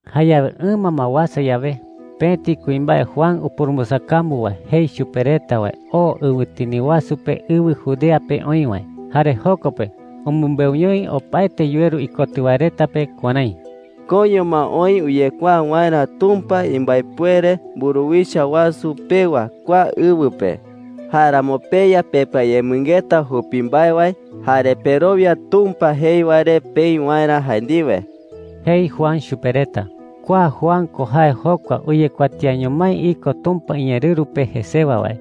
Jayawe ɨma ma uasa yawe, pëti kuimbae Juan upurumbɨsakambu wae jei chupe reta wae oo ɨwɨtini wasu pe ɨwɨ Judea pe oï wae. Jare joko pe umɨmbeuñoi opaete yuweru ikotɨ wae reta pe kuärái: “Koiño ma oï uyekuaa waerä Tumpa imbaepuere mburuwicha wasu pewa kua ɨwɨ pe. Jáeramo peya pepɨayemɨngeta jupi mbae wae jare perowia Tumpa jei wae re peï waerä jae ndiwe,” jei Juan chupe reta. Kua Juan ko jae jokua uyekuatiaño mái iko Tumpa iñeerɨru pe jesewa wae.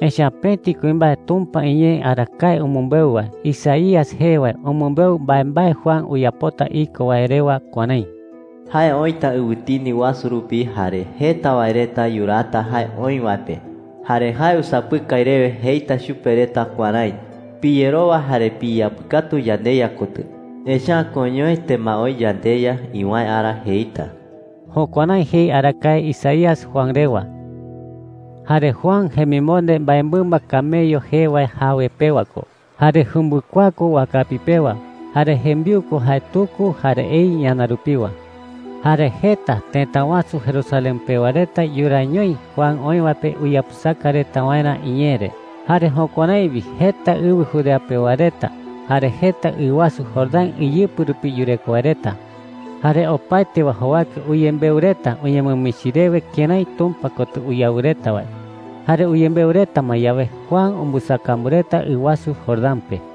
Echa’ä pëti kuimbae Tumpa iñee arakae umɨmbeu wae Isaías jee wae umɨmbeu mbaembae Juan uyapota iko wae rewa kuärái: “Jae oïta ɨwɨtini wasu rupi, jare jeta wae reta yuraata jae oï wae pe. Jare jae usapɨkai rewe jeita chupe reta kuärái: ‘Piyerowa jare piyeyapɨkatu yandeYa kotɨ, echa’ä koiñoete ma oï yandeYa iwäe ara,’ jeita.” Jukuärái jei arakae Isaías Juan rewa. Jare Juan jemimonde mbaemɨmba camello jee wae jawe pewa ko, jare jumbɨkuaa ko wakapi pewa. Jare jembiu ko jae tuku jare ei ñana rupiwa. Jare jeta tëta wasu Jerusalén pewa reta yuraañoi Juan oï wae pe uyapɨsaka reta waerä iñee re. Jare jukuärái wi jeta ɨwɨ Judea pewa reta jare jeta ɨ wasu Jordán iyɨpɨ rupi yureko wae reta. Jare opaete wae jowake uyembeu reta uñemɨmichi rewe kërái Tumpa kotɨ uyawɨ reta wae. Jare uyembeu reta ma yawe, Juan umbɨsakambu reta ɨ wasu Jordán pe.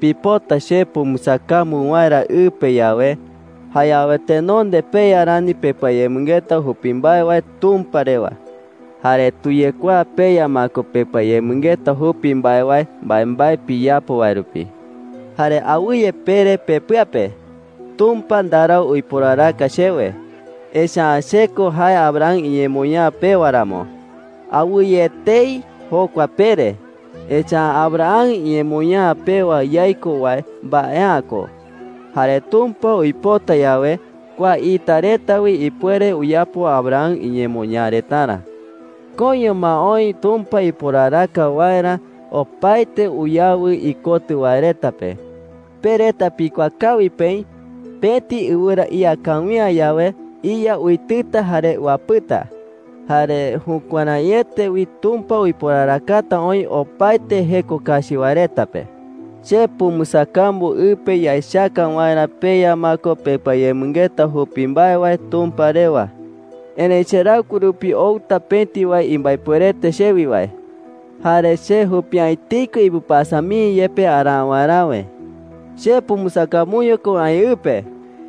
“Pipota che pumbɨsakambu waerä ɨ pe yawe, jayawe tenonde peya rani pepɨayemɨngeta jupi mbae wae Tumpa rewa. Jare tuyekuaa peya ma ko pepɨayemɨngeta jupi mbae wae mbaembae piyapo wae rupi,” jei chupe reta. “Jare awɨye pere pepɨa pe: ‘Tumpa ndarau uiporaraka chewe, echa’ä che ko jae Abraham iñemoñaa pewa ramo.’ Awɨye etei jokua pere, echa’ä Abraham iñemoñaa pewa yaiko wae mbae’ä ko. Jare Tumpa uipota yawe, kua ita reta wi ipuere uyapo Abraham iñemoñaa retarä,” jei chupe reta. “Koiño ma oï Tumpa uiporaraka waerä opaete uyawɨ ikotɨ wae reta pe. Pe reta pikuaa kawi peï pëti ɨwɨra ía kawi’ä yawe, iya uitɨta jare uapɨta. Jare jukuäraiete wi Tumpa uiporarakata oï opaete jeko kachi wae reta pe,” jei chupe reta. “Che pumbɨsakambu ɨ pe yaechaka waerä peya ma ko pepɨayemɨngeta jupi mbae wae Tumpa rewa,” jei chupe reta. “Erëi cheraɨkue rupi outa pëti wae imbaepuerete chewi wae. Jare che jupi’ä etei ko ipɨpasa mii yepe araa waeräwe,” jei. “Che pumbɨsakambuño ko aï ɨ pe,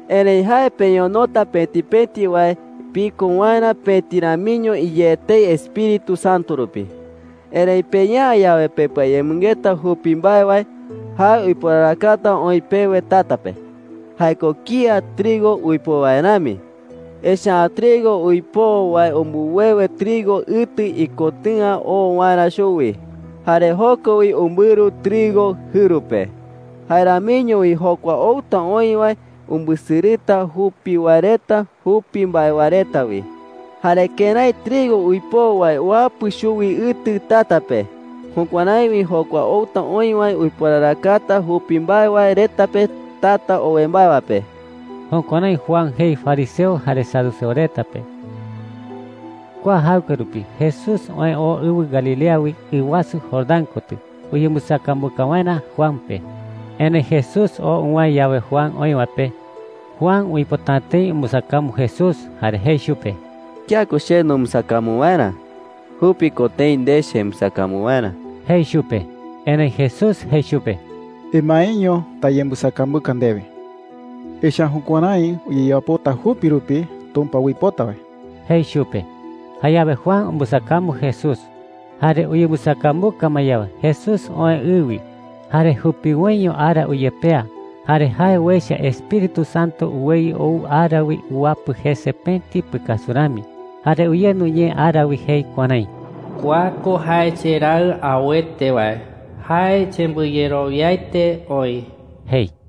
erëi jae peñonota pëti pëti wae piko waerä pëti ramiño iyé etei Espíritu Santo rupi. Erëi peya’ä yawe pepɨayemɨngeta jupi mbae wae, jae uiporarakata oï pewe tata pe,” jei chupe reta. “Jae ko kía trigo uipoo wae rami. Echa’ä trigo uipoo wae umbɨwewe trigo ɨtɨ ikotɨ̈a oo waerä chuwi, jare joko wi umbɨru trigo jɨru pe. Jae ramiño wi jokua outa oï wae umbɨsɨrɨta jupi wae reta jupi mbae wae reta wi,” jei chupe reta. “Jare kërái trigo uipoo wae uapɨ chuwi ɨtɨ tata pe, jukuärái wi jokua outa oï wae uiporarakata jupi mbae wae reta pe tata owe mbae wae pe.” Jukuärái Juan jei fariseo jare saduceo reta pe. Kua jaɨkue rupi Jesús oë oo ɨwɨ Galilea wi ɨ wasu Jordán kotɨ uyembɨsakambuka waerä Juan pe. Erëi Jesús oo uwäe yawe Juan oï wae pe, Juan uipota’ä tëi umbɨsakambu Jesús jare jei chupe: “¿Kía ko che numbɨsakambu waerä? Jupi ko tëi nde chembɨsakambu waerä,” jei chupe. Erëi Jesús jei chupe: “Emaeño tayembɨsakambuka ndewe. Echa’ä jukuärái uyeyapota jupi rupi Tumpa uipota wae,” jei chupe. Jayawe Juan umbɨsakambu Jesús. Jare uyembɨsakambuka ma yawe, Jesús oë ɨ wi. Jare jupiwoiño ara uyepea, jare jae uecha Espíritu Santo uweyɨ ou ara wi uwapɨ jese pëti pɨkasu rami. Jare uyendu ñee ara wi jei kuärái: “Kua ko jae cheRaɨ auete wae. Jae chembɨyerowiaete oï,” jei.